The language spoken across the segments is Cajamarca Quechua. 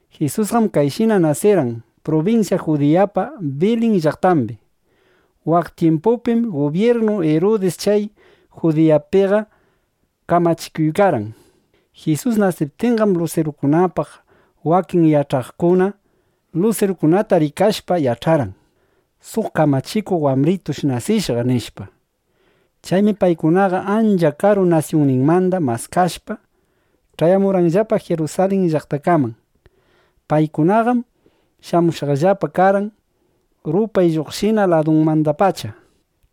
Jisusqam kayshina nasirqan prubinsya Judiyapa Bilin llaqtambi. Waq tyimpupim gubyirnu Irudis chay Judiyapiqa kamachikuykarqan. Jisus nasiptinqam, lusirukunapaq wakin yach'aqkuna lusirukunata rikashpa yach'arqan: Suq kamachikuq wambritush nasishqa, nishpa. Chaymi paykunaqa ancha karu nasyunninmanda maskashpa, ch'ayamurqanllapa Jirusalin llaqtakaman. Paykunaqam shamushqallapa karqan rupay lluqshinan ladumandapacha.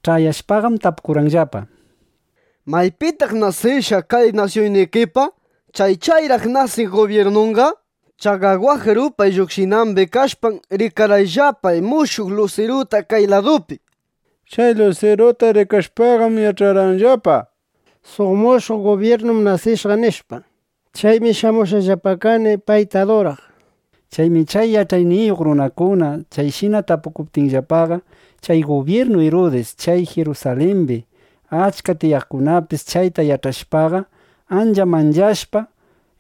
Ch'ayashpaqam, tapukurqanllapa: —¿Maypitaq nasishqa kay nasyunnikipa chay chayraq nasiq gubyirnunqa? Chaqa waq rupay lluqshinambi kashpam, rikarqayllapa mushuq lusiruta kay ladupi. Chay lusiruta rikashpaqam, yach'arqayllapa: Suq mushuq gubyirnum nasishqa, nishpa. Chaymi shamushqallapa kani, payta aduraq, nishpa. Chaymi chay yach'ayniyuq runakuna chayshina tapukuptinllapaqa, chay gubyirnu Irudis, chay Jirusalimbi achka tiyaqkunapis chayta yach'ashpaqa, ancha manchashpa,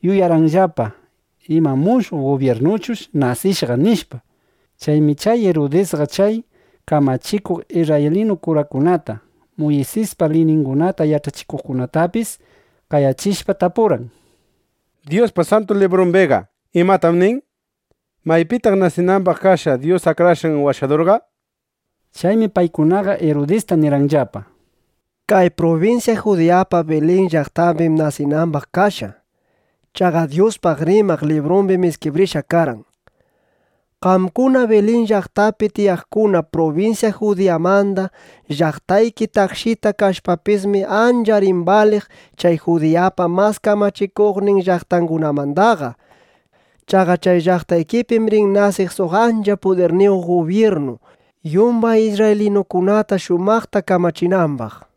yuyarqanllapa: ¿Ima, mushuq gubyirnuchush nasishqa? nishpa. Chaymi chay Irudisqa chay kamachikuq isrraylinu kurakunata, Muysispa liyningunata yach'achikuqkunatapis qayachishpa, tapurqan: —Dyuspa Santu Librumbiqa ¿imatam nin? ¿Maypitaq nasinambaq kashqa Dyus Akrashqan Washadurqa? nishpa. Chaymi paykunaqa Irudista nirqanllapa: —Kay prubinsya Judiyapa Bilin llaqtambim nasinambaqqa kashqa. Chaqa Dyuspaq rimaq librumbi iskibrishqa karqan: Qamkuna Bilin llaqtapi tiyaqkuna, prubinsya Judiyamanda llaqtayki takshita kashpapismi, ancha rin baliq chay Judiyapa mas kamachikuqnin llaqtangunamandaqa. Chaqa chay llaqtitaykipim rin nasiq suq ancha pudirniyuq gubyirnu, yumbay isrraylinukunata shumaqta kamachinambaq, nishpa.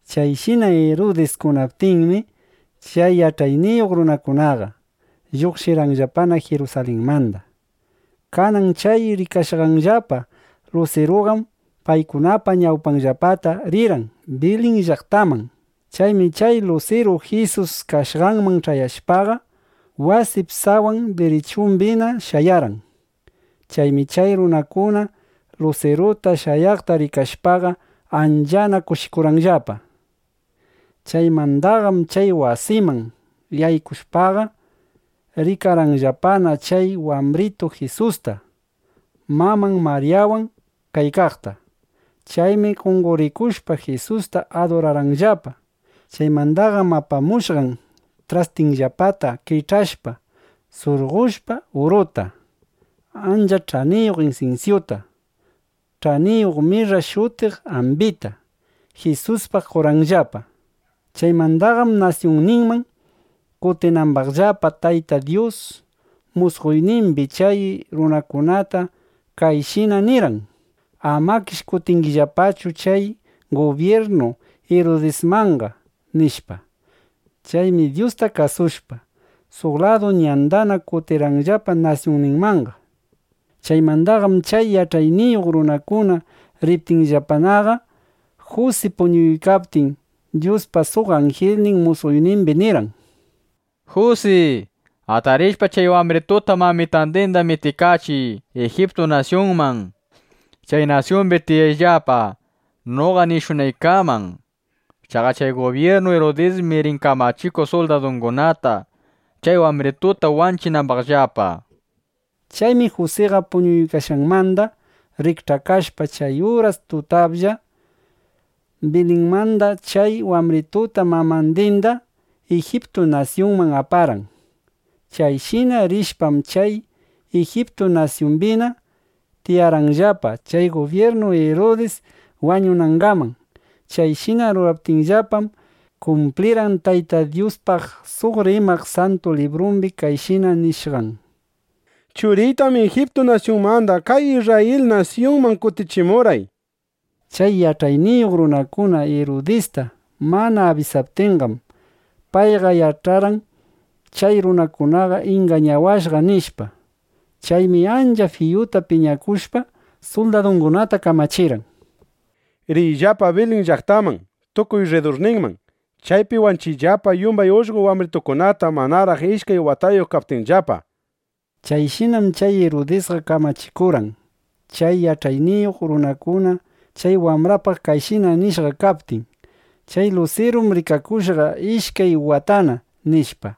Chayshina Irudis kunaptinmi, chay yach'ayniyuq runakunaqa lluqshirqanllapana Jirusalinmanda. Kanan chay rikashqanllapa lusiruqam paykunapa ñawpanllapata rirqan Bilin llaqtaman chay wambritu Jisus kashqangaman. Chaymi chay lusiru Jisus kashqanman ch'ayashpaqa, wasip sawan dirichumbina shayarqan. Chaymi chay runakuna lusiruta shayaqta rikashpaqa, anchana kushikurqanllapa. Chaymandaqam chay wasiman yaykushpaqa, rikarqanllapana chay wambritu Jisusta, maman Maryawan kaykaqta. Chaymi qonqorikushpa, Jisusta adurarqanllapa. Chaymandaqam apamushqan trastinllapata kich'ashpa, surqoshpa uruta, ancha ch'aniyuq insinsyuta, ch'aniyuq mirra shutiq ambita, Jisuspaq qorqanllapa. Chaymandaqam nasyunninman kutinambaqllapaqa, Tayta Dyus musqoynimbi chay runakunata kayshina nirqan: —Amakish kutingillapachu chay gubyirnu Irudismanqa, nishpa. Chaymi Dyusta kasushpa, suq ladu ñandana kutirqanllapa nasyunninmanqa. Chaymandaqam chay yach'ayniyuq runakuna riptinllapanaqa, Jusi puñuykaptin, Dyuspa suq anjilnin musqoynimbi nirqan: —Jusi, atarishpa chay wambrituta mamitandinda mitikachiy Ijiptu nasyunman. Chay nasyumbi tiyayllapa, noqa nishunaykaman. Chaqa chay gubyirnu Irudismi rin kamachiq suldadungunata, chay wambrituta wanchinambaqllapa, nishpa. Chaymi Jusiqa puñuykashqanmanda rikch'akashpa, chay uras tutaplla Bilinmanda chay wambrituta mamandinda Ijiptu nasyunman aparqan. Chayshina rishpam, chay Ijiptu nasyumbina tiyarqanllapa chay gubyirnu Irudis wañunangaman. Chayshina ruraptinllapam, kumplirqan Tayta Dyuspaq suq rimaq Santu Librumbi kayshina nishqan: “Churiytam Ijiptu nasyunmanda kay Isrrayil nasyunman kutichimurqay”, nishpa. Chay yach'ayniyuq runakuna Irudista mana abisaptinqam, payqa yach'arqan: Chay runakunaqam ingañawashqa, nishpa. Chaymi ancha fiyuta piñakushpa, suldadungunata kamachirqan: —Riyllapa Bilin llaqtaman tukuy rridurninman. Chaypi wanchiyllapa yumbay ullqo wambritukunata manaraq ishkay watayuq kaptinllapa, nishpa. Chayshinam chay Irudisqa kamachikurqan, chay yach'ayniyuq runakuna chay wambrapaq kayshina nishqa kaptin: “Chay lusirum rikakushqa ishkay watana”, nishpa.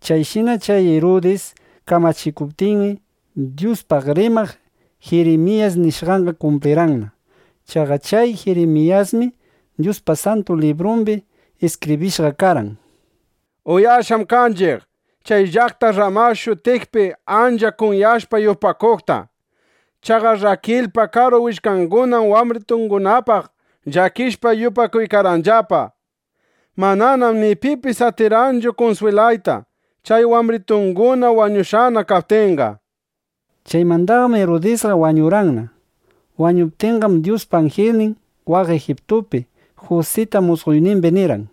Chayshina chay Irudis kamachikuptinmi, Dyuspaq rimaq Jirimiyas nishqanqa kumplirqanna. Chaqa chay Jirimiyasmi Dyuspa Santu Librumbi iskibrishqa karqan: Uyashqam kanchiq chay llaqta Rrama shutiqpi ancha kunyashpa yupakuqta. Chaqa Rrakilpa karu willkangunam wambritungunapaq llakishpa yupakuykarqanllapa. Mananam ni pipis atirqanchu kunswilayta, chay wambritunguna wañushqana kaptinqa, nishpa. Chaymandaqam Irudisqa wañurqanna. Wañuptinqam, Dyuspa anjilnin waq Ijiptupi Jusita musqoynimbi nirqan: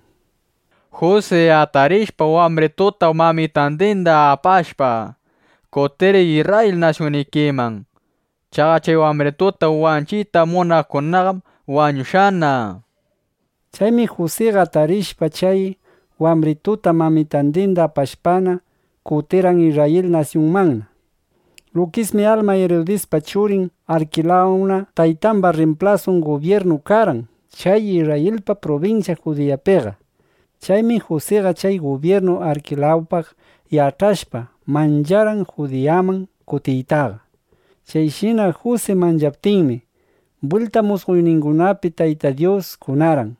—Jusi, atarishpa, wambrituta mamitandinda apashpa, kutiriy Isrrayil nasyunnikiman. Chaqa chay wambrituta wanchiyta munaqkunaqam wañushqana, nishpa. Chaymi Jusiqa atarishpa chay wambrituta mamitandinda apashpana, kutirqan Isrrayil nasyunmanna. Lukismi alma Irudispa churin Arkilawna taytamba rrimplasun gubyirnu karqan chay Isrrayilpa prubinsyan Judiyapiqa. Chaymi Jusiqa chay gubyirnu Arkilawpaq yach'ashpa, mancharqan Judiyaman kutiytaqa. Chayshina Jusi manchaptinmi, bwilta musqoyningunapi Tayta Dyus kunarqan,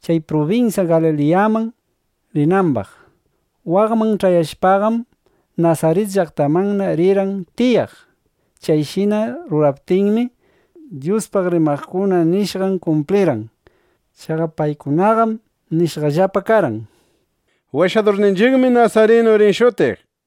chay prubinsya Galiliyaman rinambaq. Waqman ch'ayashpaqam, Nasarit llaqtamanna rirqan tiyaq. Chayshina ruraptinmi, Dyuspaq rimaqkuna nishqan kumplirqan. Chaqa paykunaqam nishqallapa karqan: “Washadurninchiqmi nasarinu rin shutiq”, nishpa.